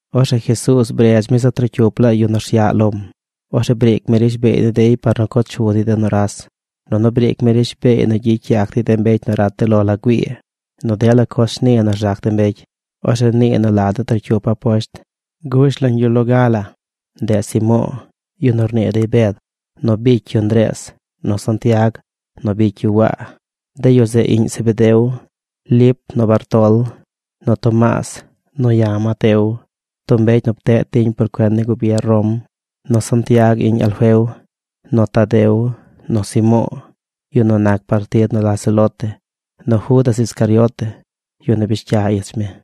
Orzeꞌ Jesuuz bredz mi zaꞌ trocyup laa yu nu rsyaꞌ lom. Orzeꞌ briic mi rishbeey ni dey par nu co chu dey de nuras, nunu briic mi rishbeey nu gyicy yac dey mbecy nu rat de lo la güii, nu dela coz shni nu rzac de mbecy. Orzeꞌ nii nu la de trocyup Aposht. Gush lañ yu loga la, ndeꞌ Simo̱o̱, yu nu rnii dey Bed, nu bicy yu Ndrees, nu Santiag nu bicy yu Waa, de yu zeꞌ iꞌñ Zebedeo, Lip nu Bartol, nu Tomaas nu ya̱, Mateo, tub mbecy nu pteꞌ tiñ por cuen ni gubier Rom, nu Santiag, iꞌñ Alfeo, nu Tadeo, nu Simo̱o̱, yu nu nac partid nu la Celote, nu Judas Iscariote, yu nu bish cya ich mi.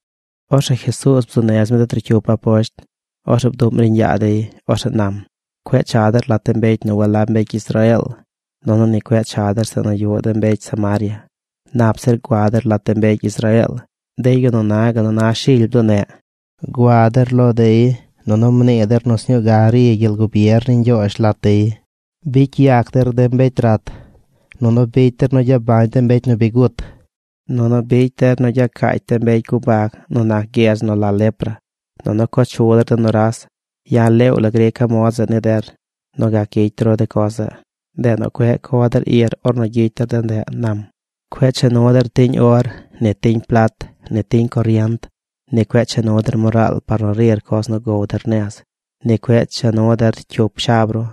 Orzeꞌ Jesuuz bzuu nez mi de trocyup Aposht. Orzeꞌ bduꞌm riiñ yaa dey. Orzeꞌ nam: ―Cueꞌ cha der lat de mbecy nu walab mbecy Israeel, nunu ni cueꞌ cha der de zeꞌ nu yuꞌ mbecy Samaria. Nap zir gua der lat de mbecy Israeel, de yu nu na gal nu na shily bduneꞌ. Gua der lo dey, nunu mnii der nu sñuu ga ri gyel gubier ni Ñgyoozh lat dey. Bicy yac der de mbecy rat, nunu bicy der nu gyabañ de mbecy gut, nunu bicy der nu gyacaacy de mbecy gubag nu nac gyedz nu la lepra, nunu co chu der de nuras. Ya̱ leew la grica̱ mod zeꞌ ni der nu gac gyicy ru de coz zeꞌ. Ndeꞌ nu cueꞌ co der ir ornu gyicy der de ndeꞌ ―nam―. ’Cueꞌ cha nu der tiñ or, ni tiñ plat, ni tiñ corient. Ni cueꞌ cha nu der moraal par nu rir coz nu gow der nez. Ni cueꞌ cha nu der cyup shab ru.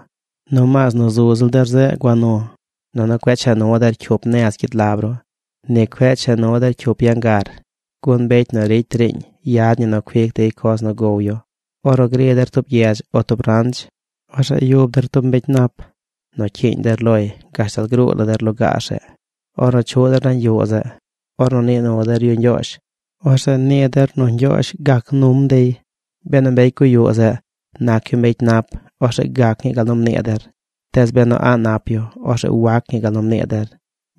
Nomaas nu zu ziꞌl der zeꞌ gua nu. Nunu cueꞌ cha nu der cyup nez gyid lab ru. Ni cueꞌ cha nu der cyup yangar. Gun mbecy nu ricy riiñ yad ñi nu cuic dey coz nu gow yu. ’Ornu gri der tub gyedz o tub ranch, orzeꞌ yub der tub mbecy nap, nu cyiiñ der loy gashtal gruu la der lugaar zeꞌ. Ornu chuꞌ der nañ yuꞌ zeꞌ, ornu nii nu der yu ñgyoozh, orzeꞌ nii der nu Ñgyoozh gac num dey. Benu mbecy guyuꞌ zeꞌ nac yu mbecy nap, orzeꞌ gac ñii gal nu mnii der. Tees benu a̱ꞌ nap yu, orzeꞌ wac ñi gal nu mnii der.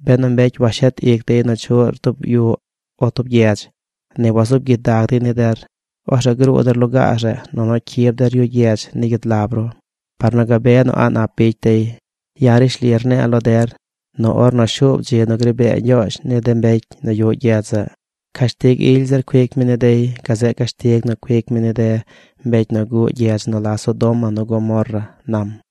Benu mbecy washet ic dey nu chuꞌr tub yuꞌ o tub gyedz, ni wazuub gyidag dey ni der, orzeꞌ gruu der lugaar zeꞌ nunu cyib der yu gyedz ni gyid lab ru par nu gabe nu a̱ꞌ nap bicy dey. Ya̱ rishli rne̱e̱ lo der nu ornu shuub dzi nu gri bee Ñgyoozh ni de mbecy nu yuꞌ gyedz zeꞌ, cashtig ily zir cuic mi ni dey gazeꞌ cashtig nu cuic mi ni de mbecy nu guꞌ gyedz nu la Sodoma nu Gomorra ―nam―.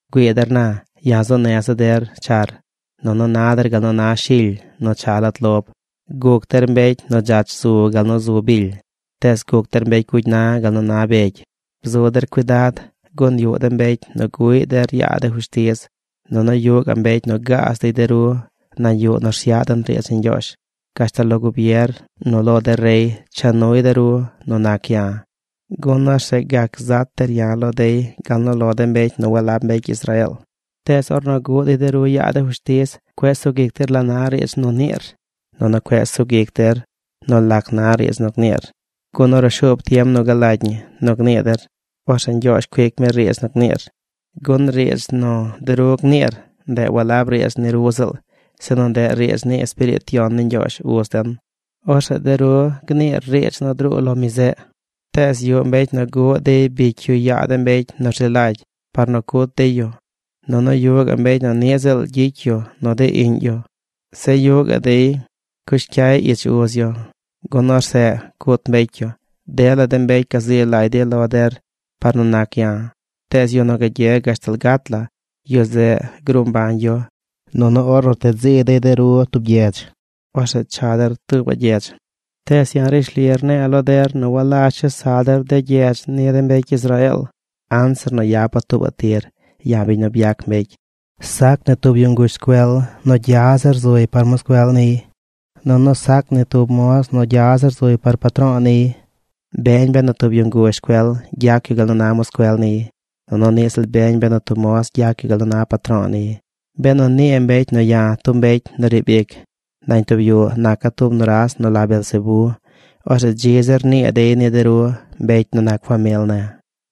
’Güii der na. Ya̱ zu neza̱ der char. Nunu na der gal nu na shily nu cha lat lob. Guc der mbecy nu dzach zu gal nu zu bily, tees guc der mbecy gugy na gal nu na begy. Bzu der cuidad gun yuꞌ de mbecy nu guꞌy der yaa de fushtiz nunu yuꞌ gaꞌ mbecy nu gaaz dey de ru nañ yuꞌ nu rsyaꞌ den riidz ni Ñgyoozh. Gashtal lo gubier nu lo de rey cha nu dey de ru nu nac ya̱, gun orzeꞌ gac zat der ya̱ lo dey gal nu lo de mbecy nu walab mbecy Israeel. Tees ornu guꞌ dey de ru yaa de fushtiz, cueꞌ sug ic der la na riidz nu niir nunu cueꞌ sug ic der nu lac na riidz nu gniir, gun ornu shuub tiem nu galagy ñi nu gnii der, orzeꞌ Ñgyoozh cuic mi riidz nu gniir. Gun riidz nu de ru gniir, ndeꞌ walab riidz ni ru ziꞌl, sinu ndeꞌ riidz ni Espiriit Yon ni Ñgyoozh uz den. Orzeꞌ de ru gniir riidz nu druu lo mi zeꞌ. ’Tees yuꞌ mbecy nu guꞌ dey bicy yu yaa de mbecy nu rzi lagy par nu cut dey yu. Nunu yuꞌ gaꞌ mbecy nu ni ziꞌl gyicy nu dey iꞌñ yu. Zeꞌ yu gaꞌ dey cush cyay ich uz yu gun orzeꞌ cut mbecy yu. Dela de mbecy gazi lagy dey lo der par nu nac ya̱. Tees yu nu gagye gashtal gat la, yu zeꞌ gruu mbañ yu. Nunu ornu rted zi dey de ru tub gyedz, orzeꞌ cha der tuubaꞌ gyedz. Tees ya̱ rishli rne̱e̱ lo der nu walazh chesa der de gyedz ni de mbecy Israeel anzir nu yapa̱ tuubaꞌ tir, ya̱, biñ nu byac mbecy. ’Sac ni tub yu nguzh scuel nu zily zir nac yu par moscuel niy. Nunu sac ni tub moz nu zily zir nac yu par patro̱o̱ niy. Beñ benu tub yu nguzh scuel gyac yu gal nu na moscuel niy. Nunu niꞌ ziꞌl beñ benu tub moz gyac yu gal nu na patro̱o̱ niy. Benu nii mbecy nu ya̱, tub mbecy nu riib ic nañ tub yuꞌ, naca̱ tub nuras nu la Beelzebé, orzeꞌ dzi zir rnii dey ni de ru, mbecy nu nac famil ne̱.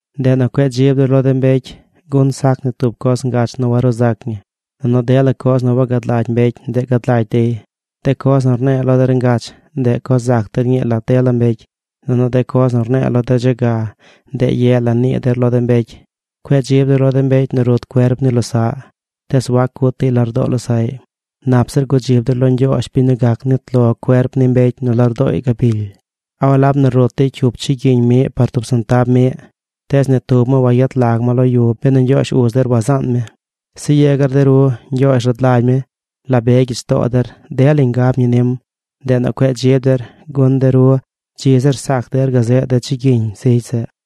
’Ndeꞌ nu cueꞌ dzib der lo de mbecy. Gun sac ni tub coz ngach nu waruu zac ñi. Nunu dela coz nu wagad lagy mbecy, ndeꞌ gad lagy dey. De coz nu rne̱e̱ lo der ngach, ndeꞌ co zac der ñii lat dela mbecy. Nunu de coz nu rne̱e̱ lo der dze ga, ndeꞌ ye la nii der lo de mbecy. Cueꞌ dzib der lo de mbecy nu rut cuerp ni losaꞌ, tees wac cut dey lardoo losaꞌy. Nap zir gudzib der lo Ñgyoozh biñ nu gac nit lo cuerp ni mbecy nu lardooy gabily. ’¿A walab nu rut dey cyup chigyiñ miꞌ par tub sentab miꞌ? Tees ni tub ma wayet lag ma lo yu benu Ñgyoozh uz der wazaan mi. Zeꞌ yegar de ru, Ñgyoozh rad lagy mi la be gyich too der. Delañ ngab ñi nim. Ndeꞌ nu cue dzib der, gun de ru dzi zir sac der gazeꞌ de chigyiñ zigy zeꞌ.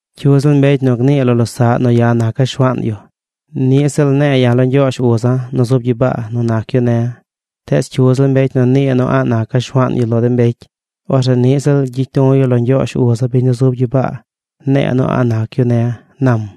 ’Cyu ziꞌl mbecy nu gnii lo losaꞌ nu ya̱ naca̱ Shuaan yu, niꞌ ziꞌl ne̱e̱ ya̱ lo Ñgyoozh uza̱ nu zub gyibaa nu nac yu ne̱. Tees cyu ziꞌl mbecy nu nii nu a̱ꞌ naca̱ Shuaan yu lo de mbecy, orzeꞌ niꞌ ziꞌl gyicya̱ du̱ yu lo Ñgyoozh, uza̱, biñ nu zub gyibaa. Ne̱e̱ nu a̱ꞌ nac yu ne̱ ―nam―.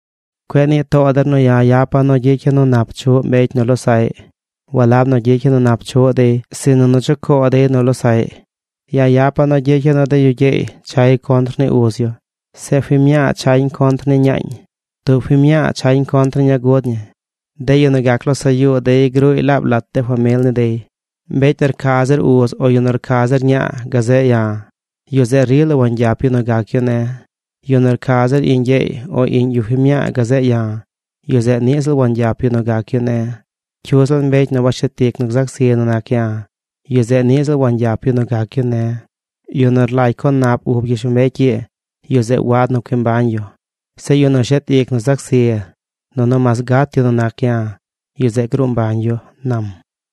’Cueꞌ nii too der nu ya̱ yapa̱ nu gyicya̱ nu nap chuꞌ mbecy nu losaꞌy. Walab nu gyicya̱ nu nap chuꞌ dey, sinu nu chucoo dey nu losaꞌy. Ya̱ yapa̱ nu gyicya̱ nu de yu gyeey chay contr ni uz yu. Zeꞌ fiñ mñaa chañ contr ni ñaañ. Tub fiñ mñaa chañ contr ni ñaa gud ñi. De yu nu gac losaꞌ yuu dey gruuy laab lat famil ni dey. ’Mbecy nu rca zir uz, o yu nu rca zir ñaa gazeꞌ ya̱, yu zeꞌ rila wangyap yu nu gac yu ne̱. Yu nu rca zir iꞌñ gyeey o iꞌñ yu fiñ mñaa gazeꞌ ya̱, yu zeꞌ niꞌ ziꞌl wangyap yu nu gac yu ne̱. Cyu ziꞌl mbecy nu washet ic nu gzac zi nu nac ya̱, yu zeꞌ niꞌ ziꞌl wangyap yu nu gac yu ne̱. Yu nu rlagy co nap ub gyishlombecy ii yu zeꞌ wad nu cui mbañ yu. Zeꞌ yu nu shet ic nu zac zi, nunu mas gat yu nu nac ya̱, yu zeꞌ gruu mbañ yu ―nam―.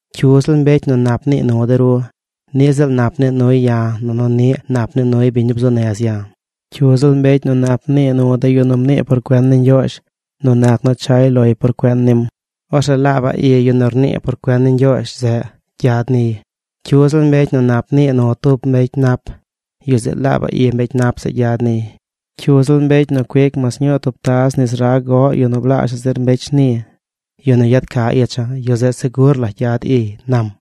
’Cyu ziꞌl mbecy nu nap nii nu de ru, niꞌ ziꞌl nap nii nuy ya̱ nunu niꞌ nap nii nuy biñ nu bzuu nez ya̱. Cyu ziꞌl mbecy nu nap nii nu de yu nu mnii por cuen ni Ñgyoozh nu nac nu chay loy por cuen nim, orzeꞌ laabaꞌ i yu nu rnii por cuen ni Ñgyoozh zeꞌ gyad niy. Cyu ziꞌl mbecy nu nap nii nu tub mbecy nap, yu zeꞌ laaba i mbecy nap zeꞌ gyad niy. Cyu ziꞌl mbecy nu cuic mas ñuu tub taz nis rag goꞌ yu nu blaazhaꞌ zir mbecy shni, yu nu yad ca icha̱, yu zeꞌ segur la gyad iy ―nam.